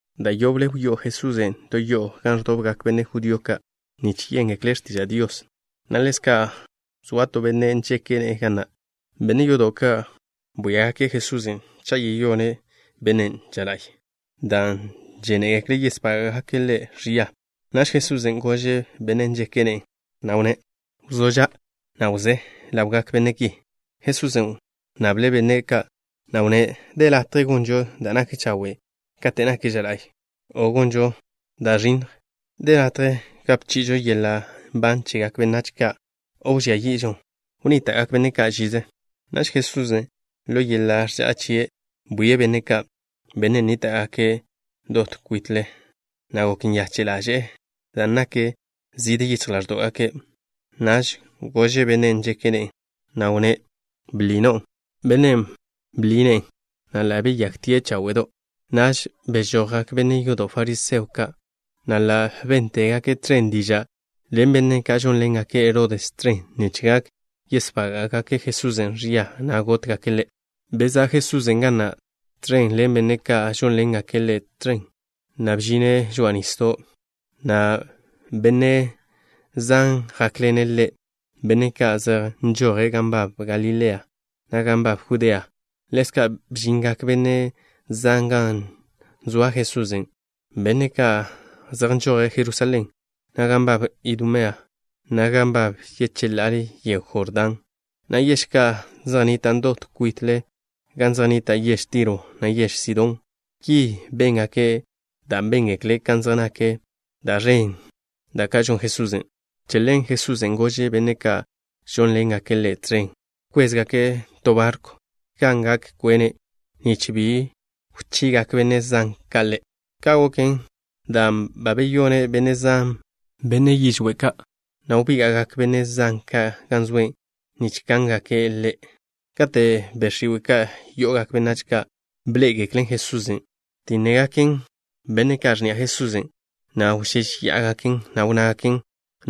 Da' yoble wyó'o Jesusen' to yo'o gan ẕdobgak benne' judío ka' nich yéngekle' x̱tiža' Dios, na' ḻezka' zoa to benne' nžeke' ne'e ga na'. Benne' yodo' ka' bwíagake' Jesusen' cha' yeyone' bennen' ža la'y, dan' žénegekle' yesbága'gake' Ḻe' ẕia. Naž Jesusen' gože' bennen' nžeke' ne'e, na' wnné': —Wzó ža', na' wzé ḻawgak benne' ki. Jesusen' wnnable' benne' ka', na' wnné': —¿De latje gonžo da' nak chawe' kate' nak ža la'y, o gonžo da' ẕinnj? ¿De latje gape chi'ižo yeḻa' nban chegak benách ka', o wžía yi'žon? Wnníta'gak žize benne' ka'. Naž Jesusen', ḻo yeḻa' ẕža'a chie', bwie' benne' ka', benne' nníta'gake' dot kwite', na' gok nyache' ḻaže'e dan' nak zide yichj ḻáẕdo'gake'. Naž gože' bennen' nžeke' ne'e, na' wnné': —Bḻi no'o. Bennen' bḻi ne'e, na' ḻa' beyakten cháwe'do'. Naž bežojgak benne' yodo' fariseo ka', na' ḻa' béntegake' tẕen diža' ḻen benne' ka' žónḻengake' Herodes tẕen nich gak yesbága'gake' Jesusen' ẕia, na' gótgake' Ḻe'. Bezá' Jesusen' ga na' tẕen ḻen benne' ka' žónḻengake' Ḻe' tẕen, na' bžine' žoa'a nisdo', na' benne' zan jákḻene' Ḻe', benne' ka' zej nžoje' gan nbab Galilea, na' gan nbab Judea. Ḻezka' bžingak benne' zan gan zoa Jesusen', benne' ka' zej nžoje' Jerusalén, na' gan nbab Idumea, na' gan nbab yecheḻá'al yego Jordán, na' yež ka' zej nnitan' dot kwit gan zej nnita' yež Tiro, na' yež Sidón. Ki béngake' dan' béngekle' kan zej nak da' ẕen ka' da' žon Jesusen'. Che ḻen Jesusen' gože' benne' ka' žónḻengake' Ḻe' tẕen wkwéztezegake' to barkw gan gak kwene', nich bi wchigak benne' zan ka' Ḻe'. Ka' goken dan' ba beyone' benne' zan, benne' yižwé' ka', na' wbíga'gak benne' zan ka' gan zoe' nich kángake' Ḻe'. Kate' be' x̱iwe' ka' yo'ogak benách ka' bḻé'egeklen Jesusen', btínnegaken benne' ka' x̱ni'a Jesusen', na' wžéžeya'agaken, na' wnnágaken: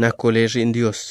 —Nako' Le' Ẕi'n Dios.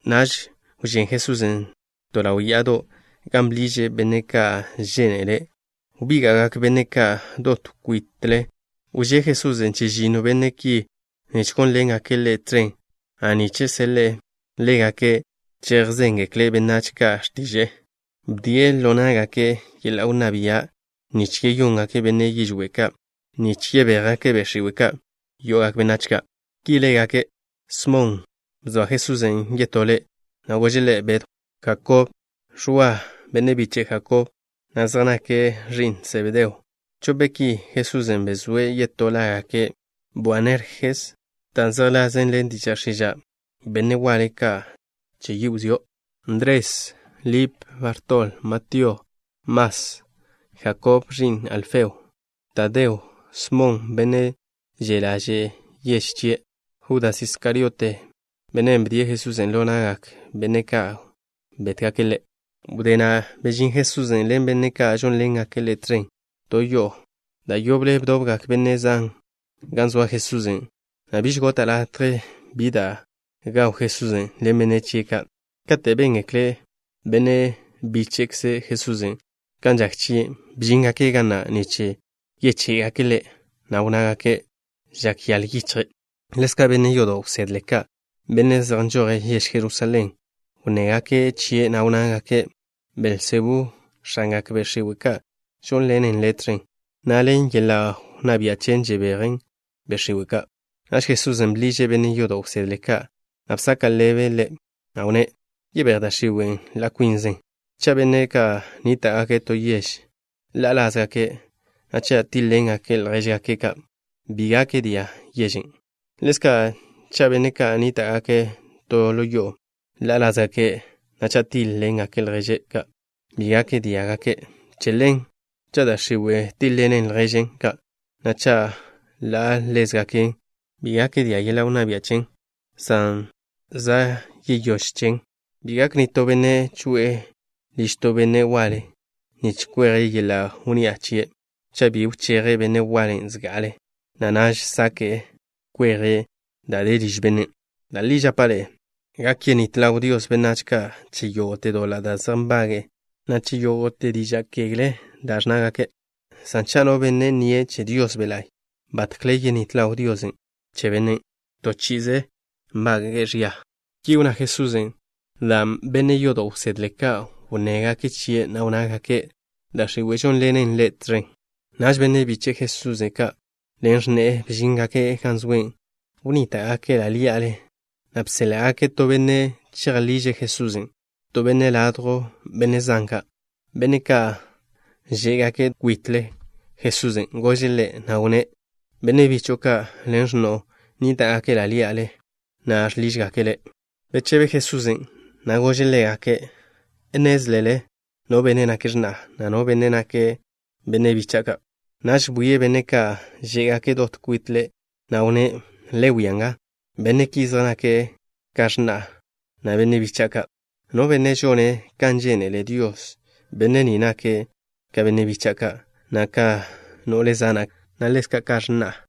Naž wžén Jesusen' to ḻaw ya'ado', gan bḻiže' benne' ka' žénele'. Wbíga'gak benne' ka' dot kwite'. Wžé Jesusen' chežinno benne' ki, nich gónḻengake' Ḻe' tẕen, na' nich seḻe'e ḻégake' chejzéngekle' benách ka' x̱tiže'e. Bdie' ḻo ná'gake' yeḻa' wnná bia' nich yeyóngake' benne' yižwé' ka', na' nich yebéjgake' be' x̱iwe' ka' yo'ogak benách ka'. Ki lágake': Smon, (bzoa Jesusen' yetó le', Bedw), Jakob, Ẕwa, (benne' biche' Jakob, na' zej nake' ẕi'n Sebedeo. Chope' ki, Jesusen' bezóe' yetó lágake', Boanerjes, da' zejḻasen ḻen diža' x̱iža': Benne' waḻe ka' ka wzió'), Ndres, Lip, Bartol, Matío, Mas, Jakob, (ẕi'n Alfeo), Tadeo, Smon, (benne' že' ḻaže'e yež chie'), Judas Iskariote, (benne' wdíe' Jesusen' ḻo na'gak benne' ka' gótgake' Ḻe'). Wdé na' bežín Jesusen' ḻen benne' ka' žónḻengake' Ḻe' tẕen to yo'o. Da' yoble bdobgak benne' zan gan zoa Jesusen', na' biž gota' latje bi da' gaw Jesusen' ḻen benne' chie' ka'. Kate' béngekle benne' bíche'kze Jesusen' ka' kan žak chie', bžíngake' ga na' nich yeché'gake' Ḻe', na' wnnágake': “Žak yaḻ yichje'.” Ḻezka' benne' yodo' wsedle ka', benne' zej nžoje' yež Jerusalén, wnnégake' chie', na' wnnágake': —Belzebú, x̱angak be' x̱iwe' ka', žónḻenen Ḻe' tẕen, na' ḻen yeḻa' wnná bia' chen žebeje' be' x̱iwe' ka'. Naž Jesusen' bḻiže' benne' yodo' wsedle ka', na' bsaka' ḻebe', na' wnné': —¿Yebéj da' x̱iwe' ḻa' kwinzen? Cha' benne' ka' nníta'gake' to yež ḻa'a lázgake', na' cha' tíḻ-ḻengake' ljéžgake' ka', bi gak dia' yežen'. Ḻezka' cha' benne' ka' nníta'gake' to yo'o ḻa'a lázgake', na' cha' tíḻ-ḻengake' ljéžgake' ka', bi gak diá'gake'. Che ḻen, cha' da' x̱iwe' tíḻ-ḻenen lježen ka', na' cha' ḻa'a lázgaken, bi gak dia' yeḻa' wnná bia' chen, san za' yeyóž chen. ’Bi gak nitó benne' choe'e liž to benne' waḻe, nich kweje' yeḻa' wnni'a chie' cha' bi wcheje' benne' waḻen' zga'ale, na' naž sake'e kweje' da' de liž bennen'. ’Da' li žapa' ḻe'e: gak yenít ḻaw Dios benách ka' che yógo'te doḻa' da' zej nbage'e, na' che yógo'te diža' x̱iwe' da' ẕnnágake', san cha' no benne' nnie' che Dios Be' La'y, batkle yenít ḻaw Dios bennen'. To chi'ize nbage'e ẕia. Ki wnná Jesusen' dan' benne' yodo' wsedle ka' wnnégake' chie', na' wnnágake': “Da' x̱iwe' žónḻenen Ḻe' tẕen.” Naž benne' biche' Jesusen' ka' ḻen x̱ne'e bžíngake' gan zoe'. Wnníta'gake' ḻa' ḻí'ale, na' bséḻa'gake' to benne' chejḻiže' Jesusen'. To benne' ladjw benne' zan, benne' ka' žé'gake' dot kwit Jesusen' gože' Ḻe', na' wnné': —Benne' bicho'o ka' ḻen x̱no'o, nníta'gake' ḻa' ḻí'ale, na' žḻižgake' Le'. Bechebe Jesusen', na' gože' ḻégake': —¿Nnézlele no benne' nake' x̱na'a, na' no benne' ka' zej nake' bicha'a ka'? Naž bwie' benne' ka' žé'gake' dot kwite', na' wnné': —Le wia nga. Benne' ki zej nake' ka x̱na'a, na' benne' bicha'a ka'. No benne' žone' kan žénele Dios, benne' ni nake' ka benne' bicha'a, na' ka no'le zana', na' ḻezka' ka x̱na'a.